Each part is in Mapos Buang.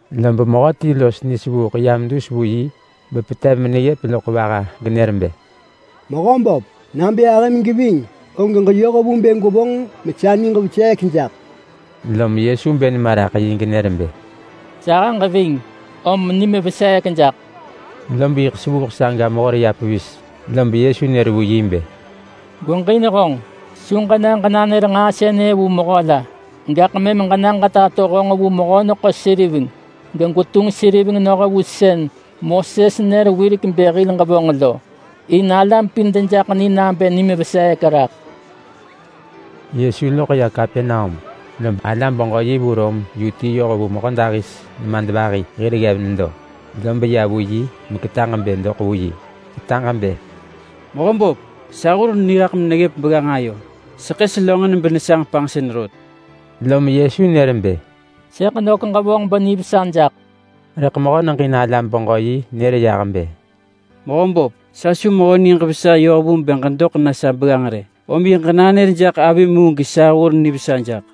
Lob mehöti los nisevuuḳ yam dus vu yi bepetev meneggëp loḳ vaha genër bë, “Mehöböp! Nabë ahëm geving og ġeyoh vu bë gwevonġ mesa niġ veseek jaḳ!” Lom Yesu bë nema raḳ yi genër bë, “Sahëġ ving! Om nim veseek jaḳ!” Lob yiḳ sevuuḳ saga mehor ya pevis. Lob Yesu nër vu yi bë, “Gweġin honġ! Su ġena ġenanër nġaa sënë vu mehö la. Gaḳ mëm ġena ġetato honġ vu mehö-neḳo-seriveng gegwetunġ seriveng noh vu sën Moses nër wirek bë hil ġevonġ lo, in alam pin dejaḳ ni nabë nim veseek raḳ.” Yesu loḳ ya Kapernaum, lob alam-beġö-yi vu Rom yu ti yoh vu mehödahis nemadvahi hir ggev nedo, lob ya vu yi meketaġ bë doḳ vu yi. Ketaġ bë, “Mehöböp! Sa hur niraḳ meneggëp begganġ ayo; seḳë selönġin benesanġ panġsën rot.” Lom Yesu nër bë, “Sëḳ nök ġevonġ benivesa jaḳ.” Rëḳ mehö neġin alam-beġö-yi nër yah bë, “Mehöböp, sa su mehö niġ vesa yoh vu bë ġedoḳ na sa begganġ rë. Om yiḳ ġenanër jaḳ avim mu gesa hur nivesa jaḳ.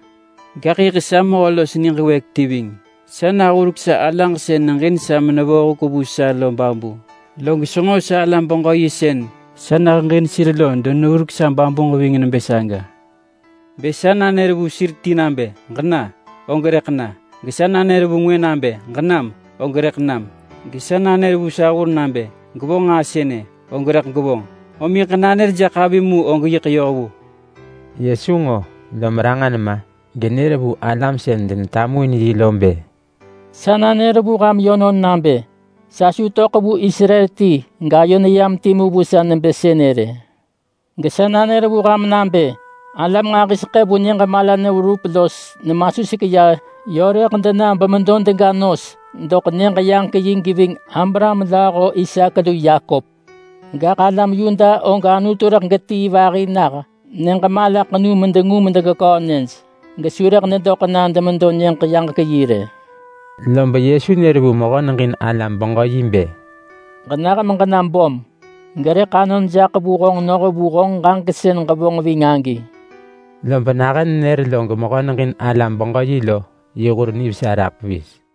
Gaḳ yiḳ sa mehö los niġ wëëk ti ving. Sa nahurek sa alaġ sën neġin sa menevo huk vu sa lo babu, log senġo salam-beġö-yi sën sa neheġin sir lo deneggurek sa babuġ ving nebë saga. Bë sa nanër vu sir ti nabë, ‘Ġena!’ og rëḳ na, gesa nanër vu ngwë nabë, ‘Ġenam!’ og rëḳ nam. Gesa nanër vu sa hur nabë, ‘Gwevonġ nġaa sënë!’ og rëḳ gevonġ. Om yiḳ ġenanër jaḳ avim mu og yiḳ yoh vu.” Yesu nġo, lom ranġa nema genër vu alam sën denetamuin yi lo bë, “Sa nanër vu ham yönon nabë sa su töḳ vu Israel ti gayo neyam timu vu sa nebë sënë rë. Gesa nanër vu ham nabë alam nġahiseḳë vu nyëġ mala neverup los nemasuseḳ ya yö rëḳ dena bemedo dega nos doḳ Nyëġ-yaġek-yi geving Abraham lööho Isaak lu Yakop. Gaḳ alam Yuda og Anutu rëḳ getii vahi na nyëġ malaḳenu dobnë medengu medegeköö nyëj, gesu rëḳ dedoḳ na demedo Nyëġ-yaġek-yi rë. Lob Yesu nër vu mehö neġin alam-beġö-yi bë, “Ġenah meġena böm, gerëḳ anon jaḳ vu honġ noh vu honġ ġaġek sën ġevonġ ving agi.” Lob nahën nenër log mehö neġin alam-beġö-yi lo yi hur nivesa raḳ pevis.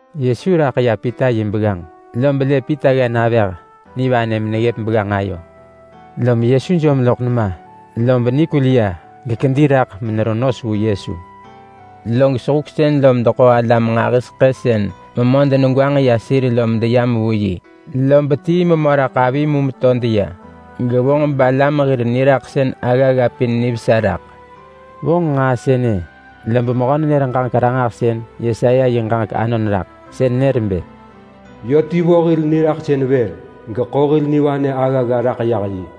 Yesu raḳ ya Pita yi begganġ, lob lë Pita ggen avëh nivanë meneggëp begganġ ayo. Lom Yesu jom loḳ nema, lob nikul ya gekedi raḳ menevonġ nos vu Yesu. Log sehuksën lom deḳo alam nġahiseḳë sën memö denegwanġ ya sir lo medeyam vu yi, lob tii memö raḳ avi mu meto deya, gevonġ balam hir niraḳsën aggagga pin nivesa raḳ. Vonġ nġaa sënë lob mehö-nenër-ġaġek-ranġahsën Yesaya yi ġaġek anon raḳ. Sën nër nebë: “Yö ti vo hil niraḳsën vër, geḳo hil nivanë aggagga raḳ yah yi.”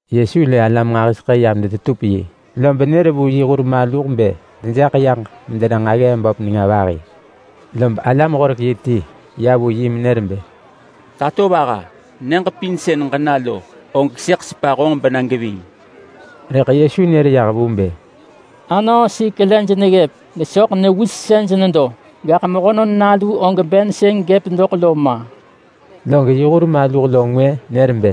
Yesu lë alam nġahiseḳë yam detetup yi, lob nër vu yi hur maluh bë dejaḳ yaġ medena nġaggee böp nenga vahi. Lob alam-horek-yi ti ya vu yi menër bë, “Tatovaha! Nyëġ pin sën ġena lo, og sëḳ sepa honġ bena geving.” Rëḳ Yesu nër yah vu bë, “Anöösik lej neggëp, gesoḳ newisej nedo, gaḳ Mehönon Nalu og ben sën gëp doḳ lo ma!” Log yi hur maluh lo ngwë nër bë,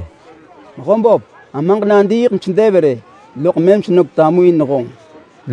“Mehöböp! Amaġ nadiiḳ besedev rë, loḳ mëm senök tamuin honġ.”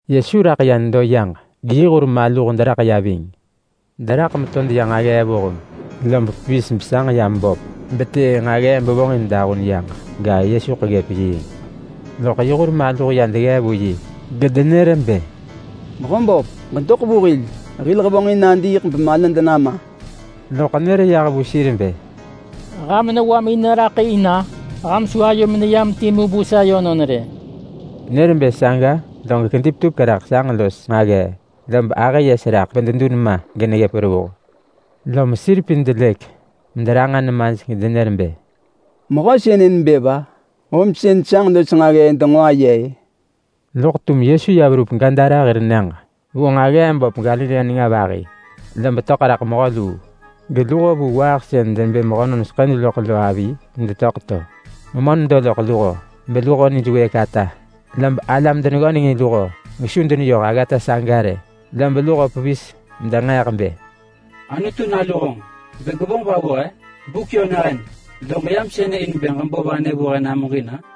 Yesu raḳ ya nedo yaġ geyi hur maluh deraḳ ya ving. Deraḳ meto deya nġaggee vuheng, lob pevis besanġ yam böp bevonġ nġaggee sis bevonġin dahun yaġ. Rëḳ Yesuḳ ggëp yiing. Loḳ yi hur maluh ya deggee vu yi gedenër bë, “Mehöböp! Ġedoḳ vu hil! Hil hevonġin nadiiḳ bemalad nama!” Loḳ nër yah vu sir bë, “Ham newamin neraḳ in-a? Ham su ayomin neyam timu vu sa yönon rë!” Nër bë saga log kedi petupek raḳ sanġ los nġaggee, lob ahë yes raḳ bededun ma geneggëp. Lom sir pin delëk mederanġa nemaj gedenër bë, “Mehö sënë nebë va? Om sën sanġ los nġaggee denġo aye-ë!” Loḳ tum Yesu ya verup Gadara hir nyëġ vu nġaggee nenga vahi, lob töḳ raḳ mehö luu, geluho vu waaḳ sën denebë mehönon seḳëj loḳ lo avi medetöḳ to. Memö nedo loḳ luho beluho nij wëëk ata, lob alam deneggönengin luho gesu deneyoh aggata saga rë. Lob luho pevis bedenġeeḳ bë, “Anutu Nalu honġ! Bë gwevonġ va vu he? Buk yö nahën, log ġeyam sënë in bë ġebo vanë vu he namuġin-a?”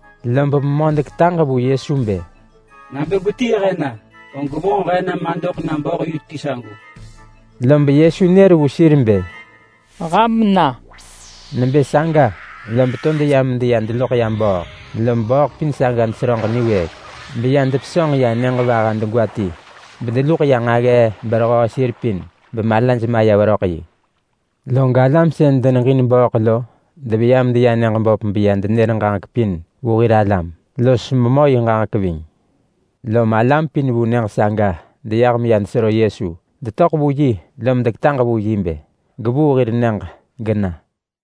Lob memö deketaġ vu Yesu bë, “Nabë gwetii he na, og gwevonġ he na madoḳ na bööḳ yu ti sagu!” Lob Yesu nër vu sir bë, “Ham na!” Nebë saga lob to deya meya deloḳ ya bööḳ, lob bööḳ pin saga deseröġ niwëëk beya depesönġ ya nyëġ vaha degwa ti, bedeluḳ ya nġaggee berehöö sir pin bemalaj maya veröḳ yi. Log alam sën deneġin bööḳ lo deveya medeya nyëġ böp beya denër ġaġek pin ranġah vu hir alam, los memö yi ġaġek ving. Lom alam pin vu nyëġ saga deyah medeya denesero Yesu. Detöḳ vu yi lom deketaġ vu yi bë gevuu hir nyëġ gena.